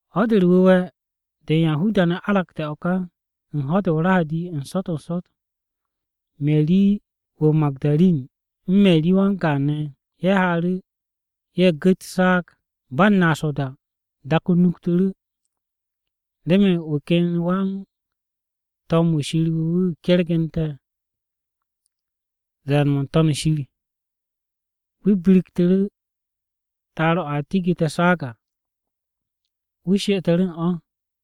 Ho̱-de u̱r-Wu̱we̱ de u̱n Yahuda-ne̱ aragte̱ o̱ ka, u̱n ho̱-de o-Rahadi n-sot n-sot, Meri wu̱ o-Magu̱darin u̱n Meri wan-gaan ne̱, ye̱ haaru̱, ye̱ gu̱t o-saag. Ba u̱n naas o-da, dak-o nuktu̱ru̱, remen wu̱ ken wan-to̱m-wu̱ Wan-Ko̱yan wu̱ kergu̱nte̱ ze̱e̱n-mo̱ n-To̱n shir. Wu̱ biriktu̱ru̱ ta'ar-o̱ a tigu̱te̱ o-saag à, wu̱ she'etu̱ru̱ u̱n o̱.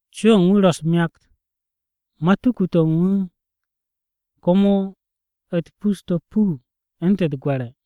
Co-o̱ u̱n wu̱ ro̱ u̱s-myakt, matuku-to̱ u̱n wu̱ komo u̱t-pus to̱ puu u̱ntu̱n u̱t-gwe̱re̱.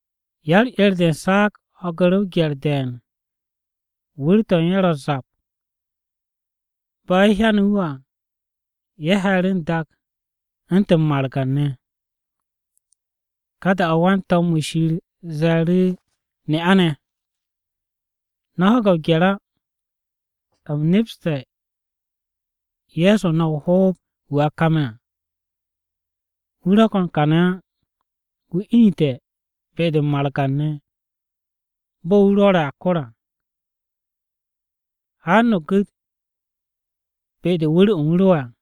Ya-u̱r-'er de u̱n saag ho̱gu̱ru̱ o-gye̱r de̱e̱n. Wu̱r-to̱ u̱n ye̱ ro̱ u̱s-zap. Bo̱ ye̱ hyane̱ wu̱ à, ye̱ he̱e̱ru̱ n-dak u̱ntu̱n margan-ne̱. Ka da-o̱ wan-to̱m-wu̱ Shir ze̱e̱ru̱ ne'a-ne̱, “No̱ ho̱ge̱ o-gye̱r á, u̱m nepste̱ Ye̱so no̱ o-hoob wu̱ a kame̱ à. Wu̱ ro̱ ko̱n kàne̱ á! Wu̱ inite̱ be-de u̱n margan-ne̱ bo̱ wu̱ rwo̱re̱ a kor à. Haan no̱ gu̱t be-de wu̱r-o̱ u̱n wu̱ ro'e̱ à.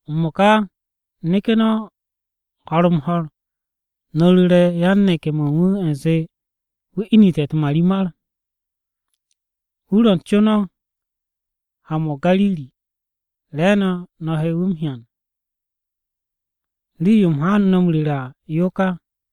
M-mo̱ka neke̱ no̱ ho̱r-m-ho̱r, no̱ ru̱re̱ yan-neke̱-mo̱ u̱n wu̱ u̱nze, wu̱ inu̱te̱ u̱t-marimar. Wu̱ ro̱ co no̱ ha-mo̱ o-Gariri, re̱e̱no̱ no̱ he wu̱ m-hyan. Rii-yo u̱m haanu̱ no̱ m-ru̱re̱ à, yo ka.”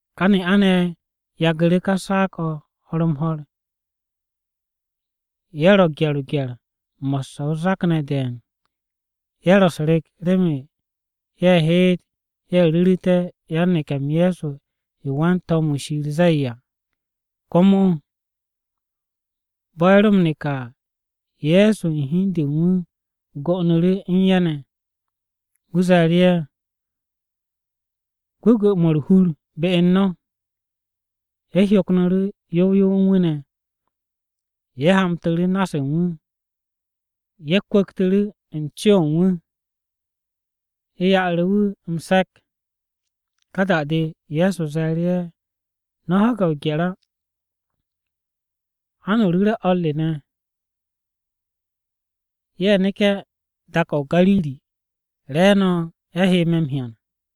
Kà ne'a-ne̱ ye̱ yagu̱ru̱ ká saag-o̱ ho̱r-m-ho̱r. Ye̱ ro̱ gye̱r-o o-gye̱r, mo̱sse̱ o-zak ne̱ de̱e̱n. Ye̱ ro̱ u̱s-rek remen ye̱ heet ye̱ ru̱ru̱té̱ yan-neke̱-m Ye̱so yo wan-to̱m-wu̱ Shir zee à. Komo bo̱ ye̱ ro̱ m-neke̱ à, Ye̱so u̱n hi u̱n de u̱n wu̱ go'onu̱ru̱ u̱n ye̱ ne̱. Wu̱ ze̱e̱ru̱ ye̱, “Gwu̱gwu̱-mo̱ u̱r-hur be u̱n no̱!” Ye̱ hyoknu̱ru̱ yow yow u̱n wu̱ ne̱. Ye̱ hamtu̱ru̱ na-se u̱n wu̱. Ye̱ kwu̱ktu̱ru̱ u̱n co-o̱ u̱n wu̱, ye̱ ya'aru̱ wu̱ m-se̱k. Ka da-de, Ye̱so ze̱e̱ru̱ ye̱, “No̱ ho̱ge̱ o-gye̱r á! Ha no̱ ru̱re̱ o̱r re ne̱. Ye̱ neke̱ dak-o̱ o-Gariri, re̱e̱no̱ ye̱ he me̱ m-hyan.”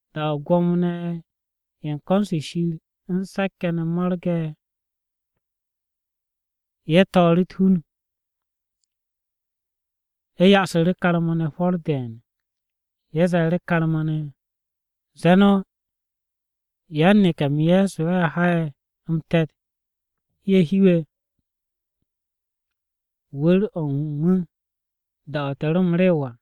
Da-o̱ Gwo̱mo-ne̱ ye̱ u̱n ko̱n-se Shir u̱n se̱k-ye̱ mo̱rge̱ à, ye̱ to̱o̱ru̱ u̱t-hun. Ye̱ ya'asu̱ru̱ karma-ne̱ hwo̱r de̱e̱n. Ye̱ ze̱e̱ru̱ karma-ne̱, “Zee no̱, ‘Yan-neke̱-m Ye̱so, ye̱ ha'e̱ m-te̱t, ye̱ hiwe̱ wu̱r-o̱ u̱n wu̱ da-o̱ te̱ ro m-rew à.’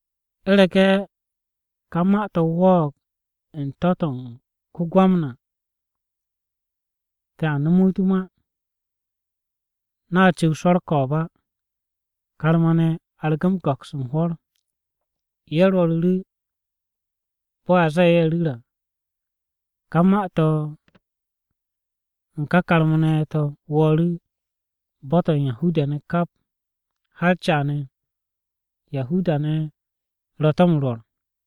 U̱rege̱ kà ma-to̱ wo̱o̱g u̱n to̱-to̱ u̱n ko-Gwamna, te̱a nomo wu̱ u̱t-ma. No̱a cu̱w swo̱ u̱r-ko̱o̱b á.” Karma-ne̱ argu̱ go̱ks u̱n hwo̱r. Ye̱ rwo̱ru̱ru̱ bo̱ a zee ye̱ ru̱r à. Kà ma-to̱ u̱n karma-ne̱ to̱ wo̱o̱ru̱ bo̱-to̱ u̱n Yahuda-ne̱ kap. Har caane̱, Yahuda-ne̱ ro̱ to̱ m-rwo̱r.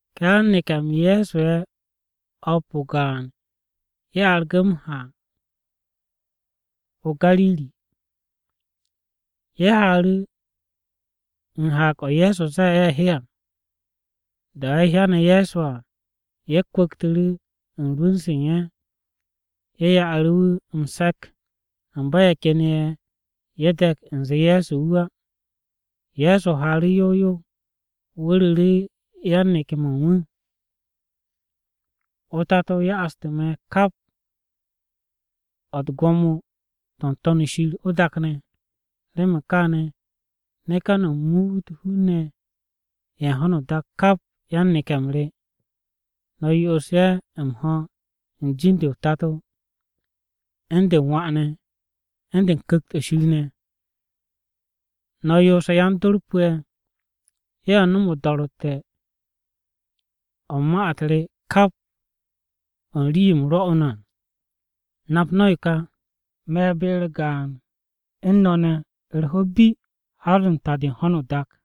Ká yan-neke̱-m Ye̱so ye̱ o̱p o-gaan ye̱ argu̱ ha-mo̱ o-Gariri. Ye̱ haaru̱ u̱n haag-o̱ Ye̱so zee ye̱ he à. Da-o̱ ye̱ hyane̱ Ye̱so à, ye̱ kwu̱ktu̱ru̱ u̱n rwu̱n-se u̱n ye̱, ye̱ ya'aru̱ wu̱ m-se̱k, amba ye̱ ken ye̱, ye̱ de̱k u̱nze Ye̱so wu̱ á. Ye̱so haaru̱ yow yow. Wu̱ ru̱ru̱ yan-neke̱-mo̱ u̱n wu̱, “o-Tato ya'astu̱ me̱ kap o̱ u̱n gwo̱mo-to̱ o-To̱n shir, o-dak ne̱. Remen kaane̱, neke̱ no̱, no̱ muut hun-ne̱ ye̱ u̱n ho̱no o-dak kap yan-neke̱-m re. No̱ yo'os ye̱ m-ho̱ u̱n jin-de o-Tato, u̱n de u̱n Wà ne̱, u̱n de u̱n Ku̱kt-o̱ Shir ne̱. No̱ yoose̱ yan-dor pu̱'e̱, ye̱ nom o-do̱ro̱tte̱ o̱ u̱n ma-u̱t re u̱n kap o̱ u̱n rii-yo u̱m rwo̱'u̱ no̱ à. Nap no̱ yo ka. Me̱ be-u̱r gaan u̱n no̱ ne̱ u̱r-ho̱ bi har u̱n ta-de ho̱no o-dak.”